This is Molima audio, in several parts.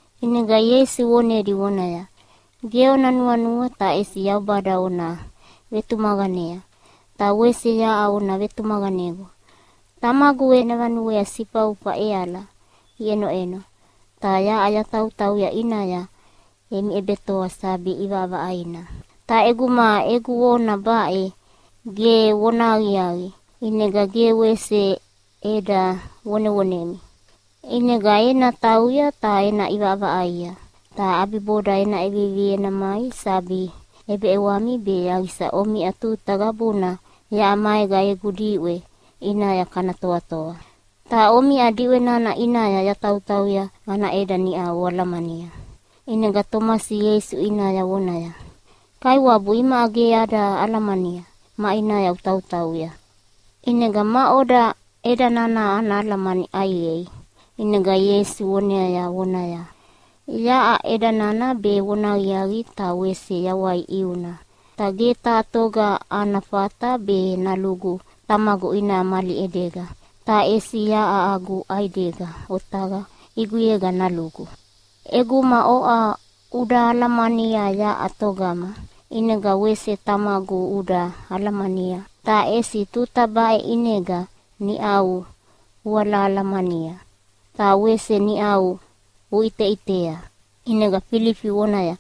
ʼInega Ieisu vonedi vonaya, “Ge ona nuanua, ta ʼesi Yaubada ona vetumaqanea, ta wese yaʼa ona vetumaqanegu. Tamagu ena vanuea sifaufa ʼeala iʼenoʼeno, ta yaʼa yatautauya ʼinaya emi ʼebetoa sabi ʼivaʼavaʼaina. Ta ʼeguma egu vona baʼe ge vonahaqiaqi, ʼinega ge wese eda vonevonemi. ʼInega ena tauya ta ena ʼivaʼavaʼaia, ta ʼabiboda ena ʼevivi ena mai sabi ʼebeʼewami be yaqisa omiʼa tuta qabuna yaʼa maega egu diʼwe ʼinaya kana toatoa. Ta omiʼa diʼwe nana ʼinaya yatautauya ana ʼeda niʼau oalamania.” ʼInega Tomasi Ieisu ʼinaya vonaya, “Kaiwabu, imaʼa ge ada alamania maʼinaya utautauya, ʼinega maʼoda ʼeda nana ana alamani ʼaiqei?” ʼInega Ieisu vonea vonaya, “Yaʼa ʼEda nana be Vonahaqiaqi ta wese Yawai ʼiuna. Ta ge taha toga ana fata be nalugu Tamagu ʼinaya mali ʼedega, ta ʼesi yaʼa agu ʼaidega otaqa ʼiguyega nalugu. ʼEguma oʼa uda alamania yaʼa togama, ʼinega wese Tamagu uda alamania. Ta ʼesi tuta baʼe ʼinega niʼau ualahalamania, ta wese niʼau uʼiteʼitea!” ʼInega Filifi vonaya,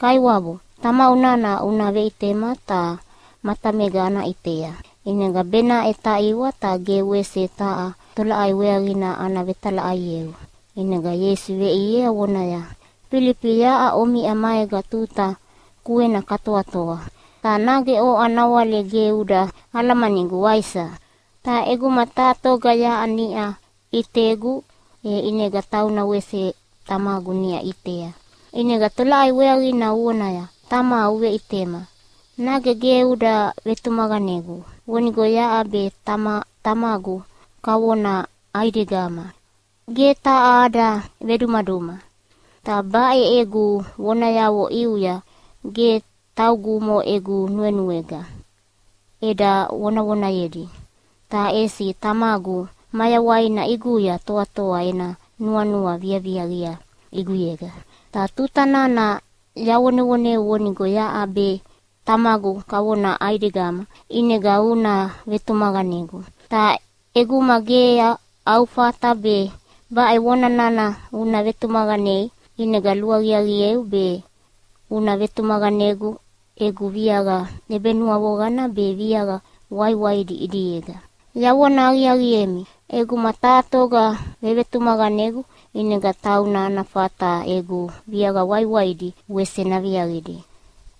“Kaiwabu, Tamau nana una veʼitema ta matamega ana ʼitea, ʼinega benaʼe taʼiwa ta ge wese taha tolaʼai weaqina ana vetalaʼaieu.” ʼInega Ieisu veʼiea vonaya, “Filifi, yaʼa omiʼa maega tuta kuena katoatoa, ta nage oʼa nawale ge uda alamanigu, waisa? Ta ʼeguma taha toga yaʼa niʼa ʼitegu, e ʼinega tauna wese Tamagu niʼa ʼitea. ʼInega tolaʼai weaqina uvonaya, ‘Tamau uveʼitema’? Nage ge uda vetumaqanegu vonigo yaʼa be Tamagu kavona ʼaidegama, ge taha ada vedumaduma? Ta baʼe egu vonayavo ʼiuya ge taugumo egu nuenuega eda vonavonayedi, ta ʼesi Tamagu mayawaina ʼiguya toatoa ena nuanua viaviaqia ʼiguyega. Ta tuta nana yavonevoneu vonigo yaʼa be Tamagu kavona ʼaidegama ʼinega una vetumaqanegu. Ta ʼeguma ge au fata be baʼe vona nana una vetumaqanei, ʼinega luaqiaqieu be una vetumaqanegu egu viaqa ʼebenuavoqana be viaqa waiwaidi ʼidiega. “Yavona aqiaqiemi, ʼeguma taha toga vevetumaqanegu ʼinega tauna ana fata egu viaqa waiwaidi wese naviaqidi.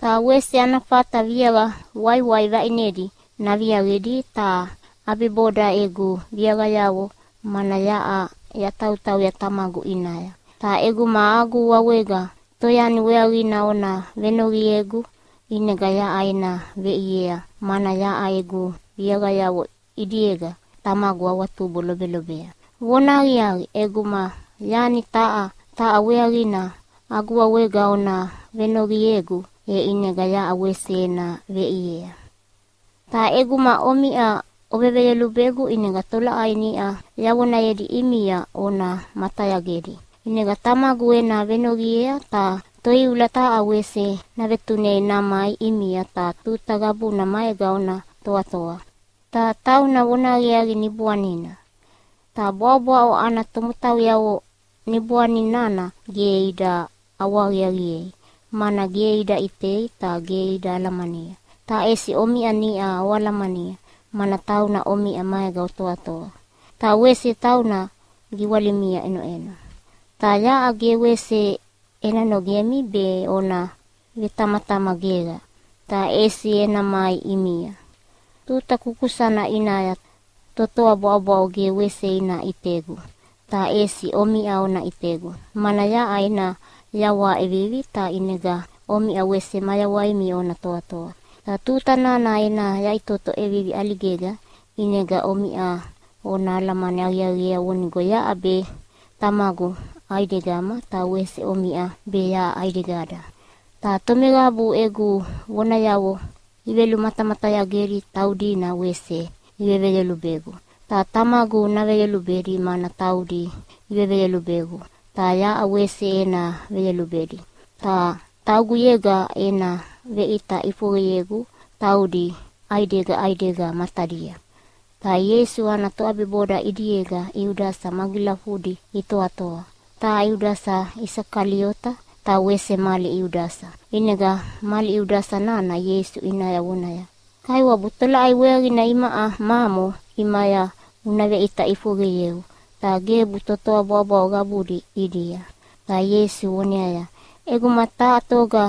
Ta wese ana fata viaqa waiwai vaʼinedi naviaqidi, ta ʼabiboda egu viaqayavo, mana yaʼa yatautauya Tamagu ʼinaya. Ta ʼeguma agu wawega toyani weaqina ona venoqiegu, ʼinega yaʼa ena veʼiea, mana yaʼa egu viaqayavo ʼidiega Tamagu awatubo lobelobea. Vonahaqiaqi, ʼeguma yani taha taha weaqina agu wawega ona venoqiegu, e ʼinega yaʼa wese ena veʼiea. “Ta ʼeguma omiʼa oveveyolubegu ʼinega tolaʼai niʼa yavonayedi ʼimia ona matayagedi. ʼInega Tamagu ena venoqiea ta Toiula taha wese navetunei namai ʼimia ta tuta qabuna maega ona toatoa, ta tauna vonahaqiaqi Niboanina. Ta bwaʼobwaʼo ana tomotauyavo Niboani nana ge ina ʼawahaqiaqiei, mana ge ida ʼitei ta ge ida alamania. Ta ʼesi omiʼa niʼa oalamania, mana tauna omiʼa maega otoatoa, ta wese tauna giwalimia ʼenoʼeno. Ta yaʼa ge wese ena nogemi be ona vetamatama geqa, ta ʼesi ena mai ʼimia. Tuta kukusana ʼinaya totoa bwaʼobwaʼo ge wese ina ʼitegu, ta ʼesi omiʼa ona ʼitegu, mana yaʼa ena yawaha ʼevivi ta ʼinega omiʼa wese mayawaimi ona toatoa. Ta tuta nana ena yaʼitoto ʼevivi ʼaligega, ʼinega omiʼa ona alamani aqiaqiea vonigo yaʼa be Tamagu ʼaidegama, ta wese omiʼa be yaʼa ʼaidegada. Ta tomeqabu egu vonayavo ivelumatamatayagedi taudina wese iveveyolubegu. Ta Tamagu naveyolubedi, mana taudi iveveyolubegu, ta yaʼa wese ena veyolubedi. Ta tauguyega ena veʼita ʼifoqeyegu taudi ʼaidega ʼaidega matadia.” Ta Ieisu ana toʼabiboda ʼidiega Iudasa magilafudi itoatoa. Taha Iudasa Isakaliota ta wese mali Iudasa. ʼInega mali Iudasa nana Ieisu ʼinaya vonaya, “Kaiwabu, tolaʼai weaqina imaʼa mamo ʼimaya una veʼita ʼifoqeyeu, ta gebu totoa bwaʼobwaʼo qabudi ʼidia?” Ta Ieisu voneaya, “ʼEguma taha toga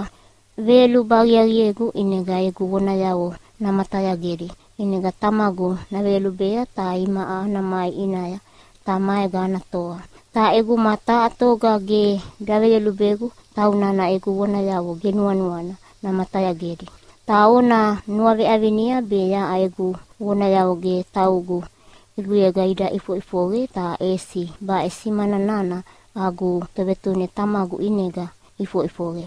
veyoluba aqiaqiegu ʼinega egu vonayavo namatayagedi. ʼInega Tamagu naveyolubea ta imaʼa ana mai ʼinaya ta maega ana toa. Ta ʼeguma taha toga ge daveyolubegu taunana egu vonayavo ge nuanuana namatayagedi. Ta ona nuaveʼavinia be yaʼa egu vonayavo ge taugu ʼiguyega ida ʼifoʼifoqe, ta ʼesi baʼe simana nana agu Tovetune Tamagu ʼinega iʼifoʼifoqe.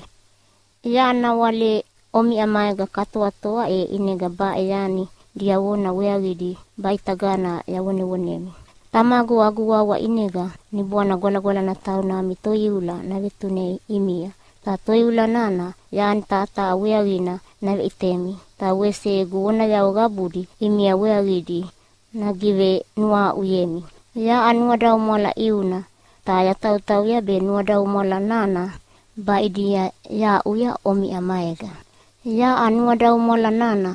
“Yaʼa nawale omiʼa maega katoatoa, e ʼinega baʼe yani diavona weaqidi baʼitagana yavonevonemi. Tamagu agu wawa ʼinega Niboana Gwalagwalana tauna ami Toiula navetunei ʼimia, ta Toiula nana yani taha taha weaqina naveʼitemi, ta wese egu vonayavo qabudi ʼimia weaqidi nagivenuahaʼuyemi. Yaʼa nuadaumwala ʼiuna, ta yatautauya be nuadaumwala nana baʼidia yahaʼuya omiʼa maega. Yaʼa nuadaumwala nana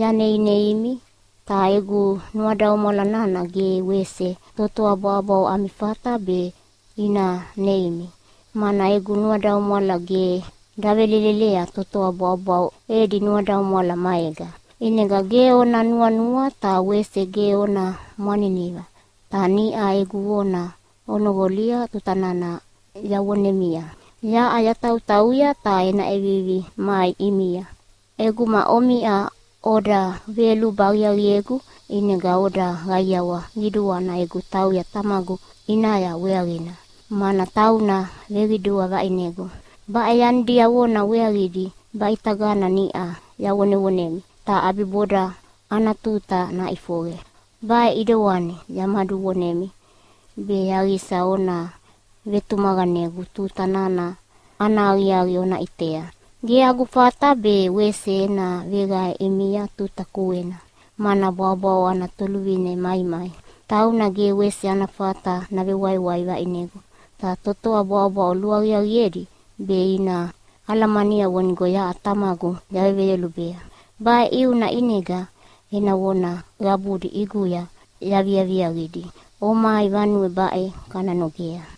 yaneineimi. Ta egu nuadaumwala nana ge wese totoa bwaʼobwaʼo adi fata be ina neimi, mana egu nuadaumwala ge davelelelea totoa bwaʼobwaʼo edi nuadaumwala maega. ʼInega ge ona nuanua ta wese ge ona mwaniniva. Ta niʼa egu vona onoqolia tuta nana yavonemia, ‘Yaʼa yatautauya, ta ena ʼevivi mai ʼimia.’ ʼEguma omiʼa oda veyoluba aqiaqiegu ʼinega oda qaiawa qiduana egu tauya Tamagu ʼinaya weaqina, mana tauna veqidua vaʼinegu. Baʼe yani diavona weaqidi baʼitagana niʼa yavonevonemi ta ʼabiboda ana tuta naʼifoqe. Baʼe ʼidewani yamaduvonemi be yaqisa ona vetumaqanegu tuta nana ana aqiaqi ona ʼitea. Ge agu fata be wese ena veqae ʼimia tuta kuena, mana bwaʼobwaʼo ana toluvine maimai. Tauna ge wese ana fata navewaiwai vaʼinegu, ta totoa bwaʼobwaʼo luaqiaqiedi be ina alamania vonigo yaʼa Tamagu yaveveyolubea. Baʼe ʼiuna ʼinega ena vona qabudi ʼiguya yaviaviaqidi. “Omai, vanue baʼena kana nogea.